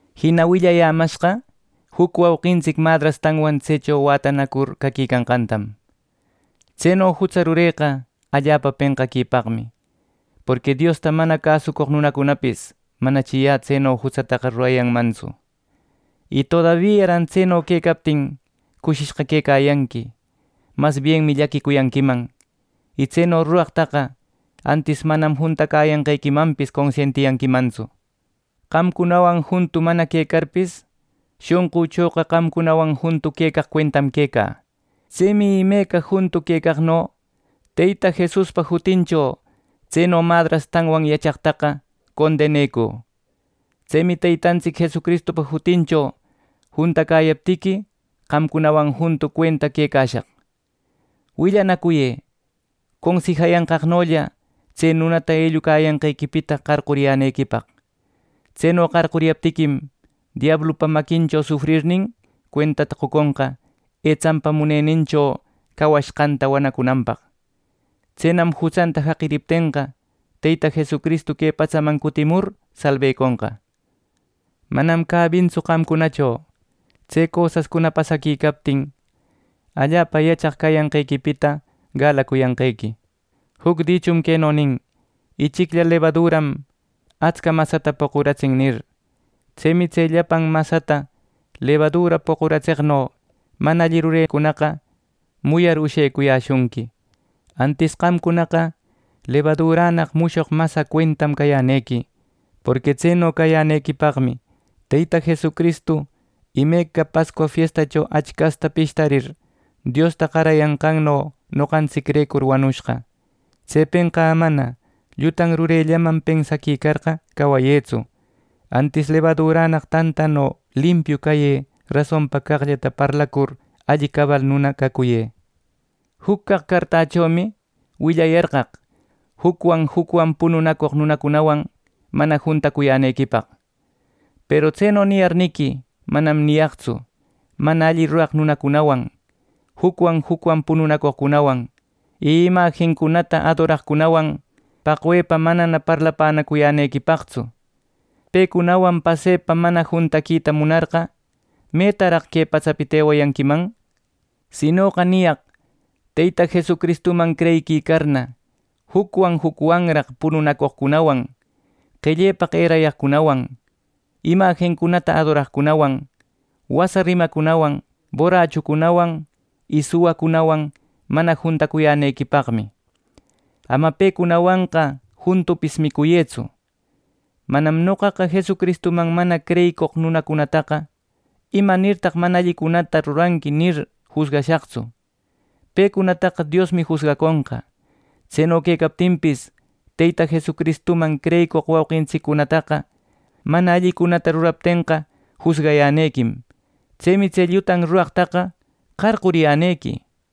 Jina willäyämashqa juc wauqintsic madrastanwan tsecho wätanacur caquicanqantam. Tseno jutsa rureqa allapa penqaquipaqmi, porqui Diosta mana cäsucoq nunacunapis manachi yä tseno jutsataqa rurayanmantsu. ¡Y todabiaran tseno quecaptin cushishqa quecayanqui! Mas bienmi llaquicuyanquiman, y tseno ruraqtaqa antis manam juntacäyanqequimanpis consientiyanquimantsu. Qamcunawan juntu mana quecarpis, shonqüchoqa qamcunawan juntu quecaq cuentam quecä. Tsemi imeca juntu quecaqno Teyta Jesuspa jutincho tseno madrastanwan yachaqtaqa condenëcü. Tsemi Teytantsic Jesucristupa jutincho juntacayaptiqui, qamcunawan juntu cuenta quecashaq. Willanacuyë consijayanqaqnolla tse nunata ellucayanqequipita qarquriyänequipaq. Tseno qarcuriyaptiquim, diablupa maquincho sufrirnin cuentata qoconqa etsanpa munennincho cawacushqanta wanacunanpaq. Tsenam jutsanta jaqiriptenqa, Teyta Jesucristu que patsaman cutimur salbeconqa. Manam cäbintsu qamcunacho tse cosascuna pasaquicaptin allapa yachaq cayanqequipita galacuyanqequi. Juc dichum queno nin: “Ichiclla lebaduram atsca masata poquratsin” nir. Tsemi tse llapan masata lebadura poquratseqno mana alli rurecunaqa muyar ushecuyäshunqui. Antis qamcunaqa lebadurannaq mushoq masa cuentam cayänequi. Porqui tseno cayänequipaqmi Teyta Jesucristu imeca Pascua fiestacho achcasta pishtarir Diosta qarayanqanno noqantsicrecur wanushqa. Tsepenqa amana llutan rurellaman pensaquicarqa cawayëtsu; antis lebadurannaq tantano limpiu cayë rasonpa caqllata parlacur alli cabal nuna cacuyë. Juc caq cartächomi willayarqaq jucwan jucwan pununacoq nunacunawan mana juntacuyänequipaq. Peru tseno niyarniqui manam niyaqtsu, mana alli ruraq nunacunawan, jucwan jucwan pununacoqcunawan y imajincunata adoraqcunawan, paqwepa manana parlapänacuyänequipaqtsu. Pecunawan pasepa mana juntaquita munarqa, ¿metaraq que patsapita ewayanquiman! Sinoqa niyaq Teyta Jesucristuman creyiquicarna, jucwan jucwanraq pununacoqcunawan, qellepaq erayaqcunawan, imajincuna adoraqcunawan, wasa rimacunawan, borrachucunawan y suwacunawan mana juntacuyänequipaqmi. Ama pecunawanqa juntupis micuyëtsu. Manam noqaqa Jesucristuman mana creyicoq nunacunataqa: “¿Imanirtaq mana allicunata ruranqui?” nir, jusgashaqtsu; pecunataqa Diosmi jusgaconqa. Tseno quecaptinpis Teyta Jesucristuman creyicoq wauqintsiccunataqa mana allicunata ruraptenqa jusgayänequim. Tsemi tse llutan ruraqtaqa qarcuriyänequi.